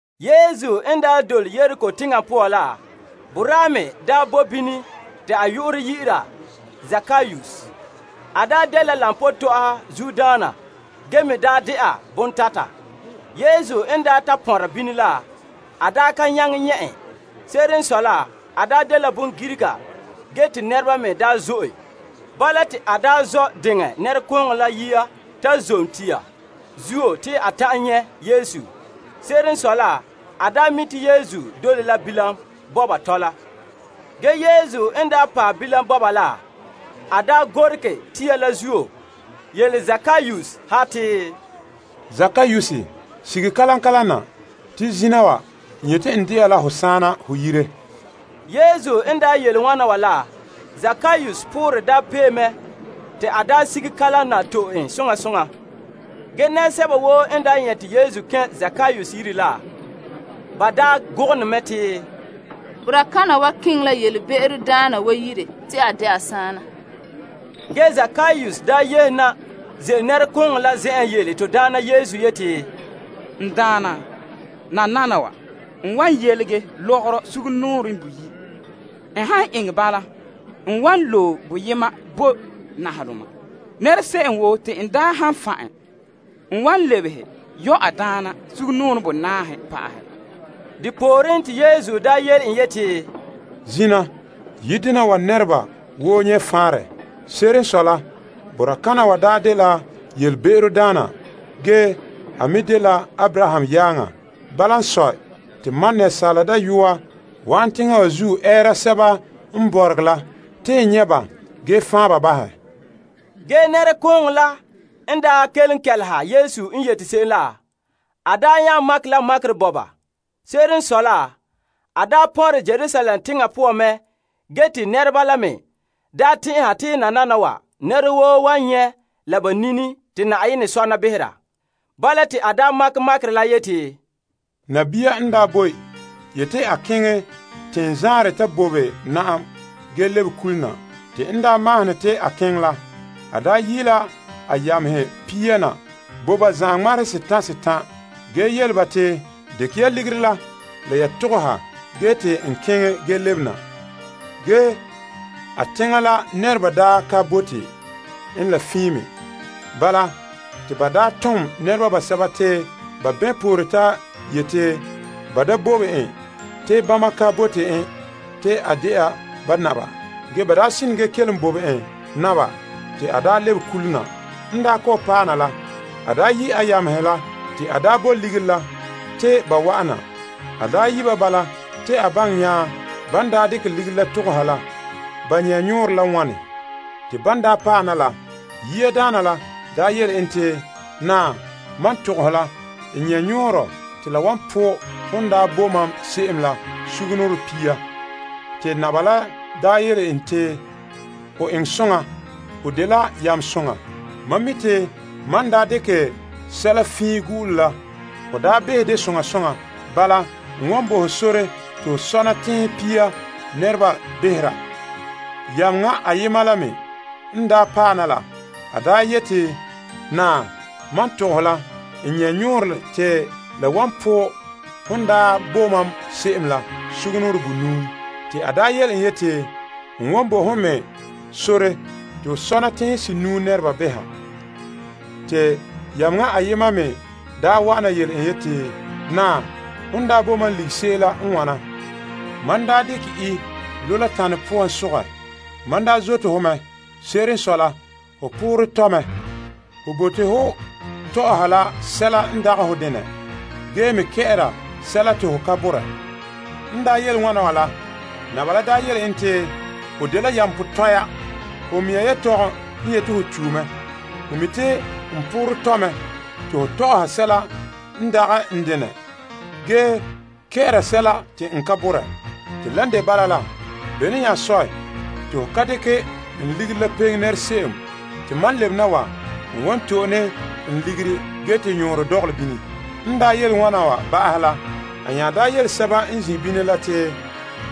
Yesu n daa dole Yeriko teŋa poan la, boraa me boe bini te a yu'urɛ dɛna Zakaeus. A dela koba tɔ'ɔha zuodaana ge me daa de'a bontata. Yesu n ta pɔnra bini la, Zakaeus ka nyaŋɛ nyɛ' en. Se'ere n sɔe la, a dela bongerega ge te nɛreba me daa zo'e. Bala te a zɔ' diŋɛ nɛrekooŋɔ la yia ta zom tia zuo te a ta'an nyɛ' Yesu. Se'ere n sɔe la, a mi' te Yesu dole la bilam bɔba tɔla. Ge Yesu n paɛ bilam bɔba la, a gorege tia la zuo yele Zakaeus ha te, Zakaeus, sige kalam kalam na, te zina wa n yete n dɛna la ho saana ho yire. Yesu n yele wana wa la, Zakaeus poorɛ pee mɛ te a sige kalam na to'e en soŋa soŋa. Ge nɛresɛba woo n nyɛ' te Yesu kɛn' Zakaeus yire la, ba gogone mɛ te, Boraa kana wa keŋɛ la yelebe'erodaana wa yire te a dɛna a saana. Ge Zakaeus yehe na ze'ele nɛrekooŋɔ la zen'en yele to Daana Yesu yeti, N Daana, nananawa, n wan yelege lɔgɔrɔ sugumnɔɔren boyi'. N han eŋɛ bala, n wan loe boyema bo nahadoma. Nɛra se'em woo te n daa han fan' en, n wan lebehe yɔ' a daana sugumnɔɔren bonaahe pa'ahɛ. Depooren, te Yesu yele en yeti, Zina, yire dena wa nɛreba woo nyɛ' faanrɛ. Se'ere n sɔe la, boraa kana wa daa dela yelebe'erodaana, ge, a me dela Abraham yaaŋa. Bala n sɔe, te Asaala Dayɔa wa'an teŋa wa zuo ɛɛra sɛba n bɔregɛ la ge fan' ba bahɛ. Ge nɛrekooŋɔ la n kelom kɛleha Yesu n yeti se'em la, a nya makɛ la makerɛ bo ba. Se'ere n sɔe la, a pɔnre Yerusalem teŋa poan mɛ ge te nɛreba la me tɛn'ɛha te nananawa, nɛra woo wan nyɛ' la ba nini te Na'ayenɛ sɔna behera. Bala te a makɛ makerɛ la yeti, Nabia n daa boe yete a keŋɛ tenzaanrɛ ta bobe na'am ge lebe kule na. Te n daa maahom ne te a keŋɛ la, a daa yi' la a yamehe pia na bo ba zan'an ŋmarehe setan' setan' ge yele ba te, dekɛ ya ligiri la la ya togoha ge te n keŋɛ ge lebena. Ge a teŋa la nɛreba daa ka bote en la fiin me. Bala, te ba daa tom nɛreba basɛba te ba bɛn' pore ta yete ba da bobe en te bama ka bote en te a de'a ba naba. Ge ba daa sine ge kelom bobe en naba te a daa lebe kule na. N daa kɔ'ɔn paɛ na la, a daa yi' a yamehe la te a daa bo ligiri la te ba wa'ana. A daa yi' ba bala te a baŋɛ nya ban daa dekɛ ligiri la togoha la, ba nyɛ' yɔɔrɔ la wane. Te ban daa paɛ na la, yiadaana la daa yele en te, naa, mam togohɛ la, n nyɛ' yɔɔrɔ te la wan po' hon daa bo mam se'em la sugumnɔɔren pia. Te naba la daa yele en te, Ho eŋɛ soŋa. Ho dela yamsoŋa. Mam mi' te mam dekɛ sɛla fiin gu'ule la, ho behɛ dɛ soŋa soŋa. Bala n wan bo ho sore te ho sɔna teŋhe pia nɛreba behera. Yameŋa ayema la me n daa paɛ na la, a yeti, naa, mam togohɛ la, n nyɛ' yɔɔrɔ te la wan po' hon daa bo mam se'em la sugumnɔɔren bonuu. Te a yele en yeti, N wan bo hon me sore te ho sɔna teŋhe senuu nɛreba behera. Te yameŋa ayema me wa'ana yele en te, naa, hon daa bo mam ligise'a la n wana. Mam daa dekɛ i lo' la tanɛ poan ta sogɛ. Mam daa zote ho mɛ. Se'ere n sɔe la, ho poorɛ tɔe mɛ. Ho bote ho tɔ'ɔha la sɛla n dagɛ ho denɛ ge me kɛ'ɛra sɛla te ho ka borɛ. N yele wana wa la, naba la yele en te, Ho dela yampotɔya. Ho mea yetɔgom n yete ho tue mɛ. Ho mi' te n poorɛ tɔe mɛ te n tɔ'ɔha sɛla n dagɛ n denɛ ge kɛ'ɛra sɛla te n ka borɛ. Te lan de bala la, bene nya sɔe te ho ka dekɛ n ligiri la peŋe nɛra se'em te mam lebe ne na wa, n wan to'e ne n ligiri ge te yɔɔrɔ dɔgɔlɛ bini? N yele wana wa ba'ahɛ la, a nya yele la sɛba n ze' bini la te,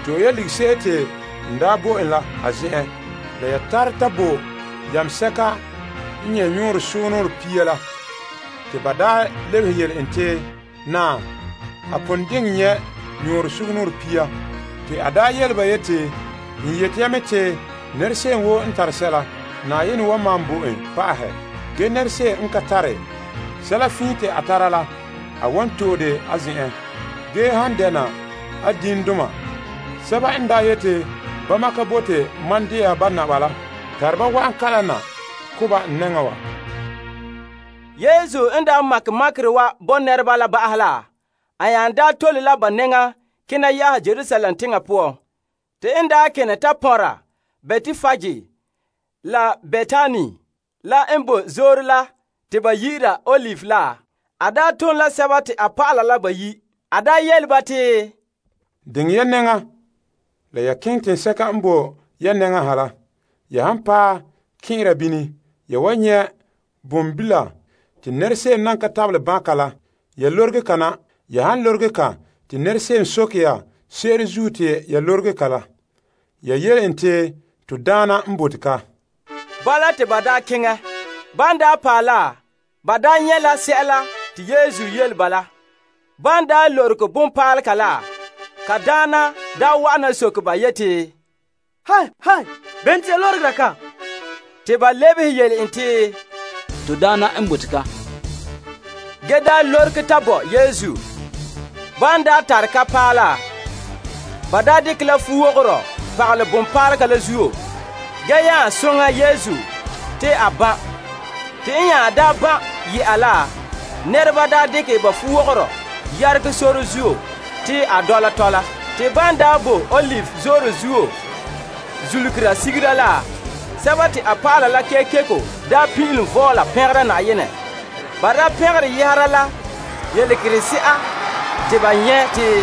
to'e ya ligise'a te n daa bo en la a zen'en la ya tare ta bo yamsɛka n nyɛ' yɔɔrɔ sugumnɔɔren pia la. Te ba lebehe yele en te, naa, a pon diŋɛ nyɛ' yɔɔrɔ sugumnɔɔren pia. Te a daa yele ba yeti, N yeti ya mɛ te nɛra se'em woo n tare sɛla, ge Na'ayenɛ wan maan bo en pa'ahɛ. Ge nɛra se'em n ka tare, ge sɛla fiin te a tara la, a wan to'e de a zen'en. Ge han dɛna n diŋdoma, sɛba n daa yete bama ka bote mam dɛna ba naba la, tare ba wa'an kalam na ko' ba n nɛŋan wa. Yesu n daa makɛ makerɛ wa bo nɛreba la ba'ahɛ la, a nya tole la ba nɛŋa kena yɛ'a Yerusalem teŋa poan. Te n kene ta pɔnra Betpage la Betani la n boe Olive Zooren la, a tom la dɔlɔba la bayi'. A yele ba te, Diŋɛ ya nɛŋa la ya keŋɛ teŋsɛka n boe ya nɛŋa ha la. Ya han paɛ kɛn'ɛra bini, ya wan nyɛ' boŋbila te nɛra se'em nan ka tabelɛ ban' ka la ya lorege ka na. Ya han lorege ka te nɛra se'em soke ya se'ere zuo te ya lɔregera ka, ya yele en te, to Daana n bote ka. Bala te ba keŋɛ. Ban paɛ la, ba nyɛ' la sɛla te Yesu yele ba la. Ban loregere boŋpaalega la, ka daana wa'ana soke ba yeti, Bene te ya lɔregera ka? Te ba lebehe yele en te, To Daana n bote ka. Ge ba lorege ta bo Yesu. Ban tare ka paɛ la, ba dekɛ la fuwogorɔ pagalɛ boŋpaalega la zuo ge nya soŋɛ Yesu te a ban'. Te en nya ban' yɛ'a la, nɛreba dekɛ ba fuwogorɔ yeregɛ sore zuo te a dɔla tɔla. Te ban boe Olive Zoore zuo zulugera sigera la, a dɔlɔba la kekeko pin'ilom vɔla pɛngera Na'ayenɛ. Ba pɛngere yɛhera la yelekerese'a te ba nyɛ' te,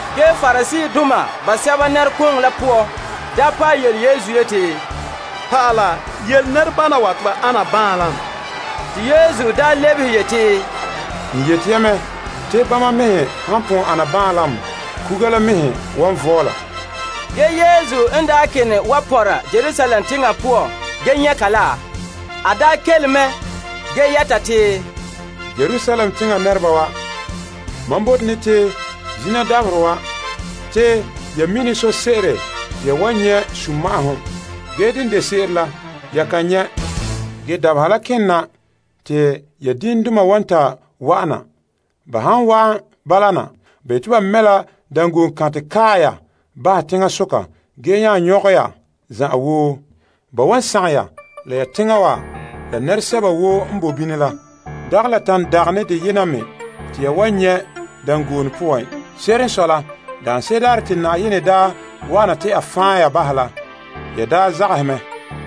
Ge Pariseedoma basɛba nɛrekooŋɔ la poan paɛ yele Yesu yeti, Pa'ala, yele nɛrebana wa te ba ana baanlam. Te Yesu lebehe yeti, N yeti ya mɛ te bama mɛhe han pon ana baanlam, kuga la mɛhe wan vɔɔla. Ge, Yesu n kene wa pɔnra Yerusalem teŋa poan ge nyɛ' ka la, a kele mɛ ge yɛta te, Yerusalem teŋa nɛreba wa, mam bote ne te zina dabaherɛ wa te ya mini sose'ere te ya wan nyɛ' sunma'ahom! Ge dene de se'ere la, ya kan nyɛ'. Ge dabeha la kena te ya diŋdoma wan ta wa'ana. Ba han wa'an bala na, ba yete ba mɛ' la dangoon kantɛ kae ya bahɛ teŋasoka ge nya yɔgɛ ya zen'an woo. Ba wan sagom ya la ya teŋa wa la nɛresɛba woo n boe bini la. Dagɛ la kugure la deyena me te ya wan nyɛ' dangoone poan. Se'ere n sɔe la, daanse'ere daarɛ te Na'ayenɛ daa wa'ana te a fan' ya bahɛ la, ya daa zagahɛ mɛ.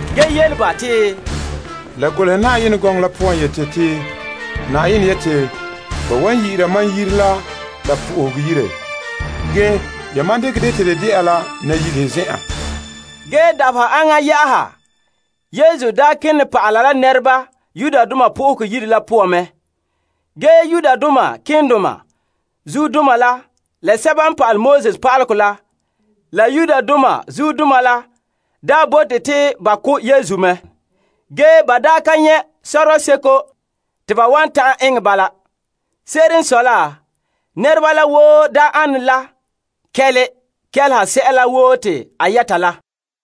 ge yele ba yeti, La golehɛ Yenɛ gɔŋɔ la poan yɛta te Na'ayenɛ yeti, Mam yire la yu'urɛ wan yi'ira la Sohoga yire. Ge yamam dekɛ dɛ nya lebege la faanreba zen'an. Ge dabeha aŋa yɛ'ɛha, Yesu kene pa'ala nɛreba Yenɛ Yire la poan mɛ. Ge malema zuodoma la pa'alegɔ pa'aleba la Yudoma zuodoma la daa bote te ba ko' Yesu mɛ. Ge ba ka nyɛ' sɔrɔɔ seko te ba wan ta'an eŋɛ bala. Se'ere n sɔe la, nɛreba la daa ane la kɛle kɛleha sɛla woo te a yɛta la.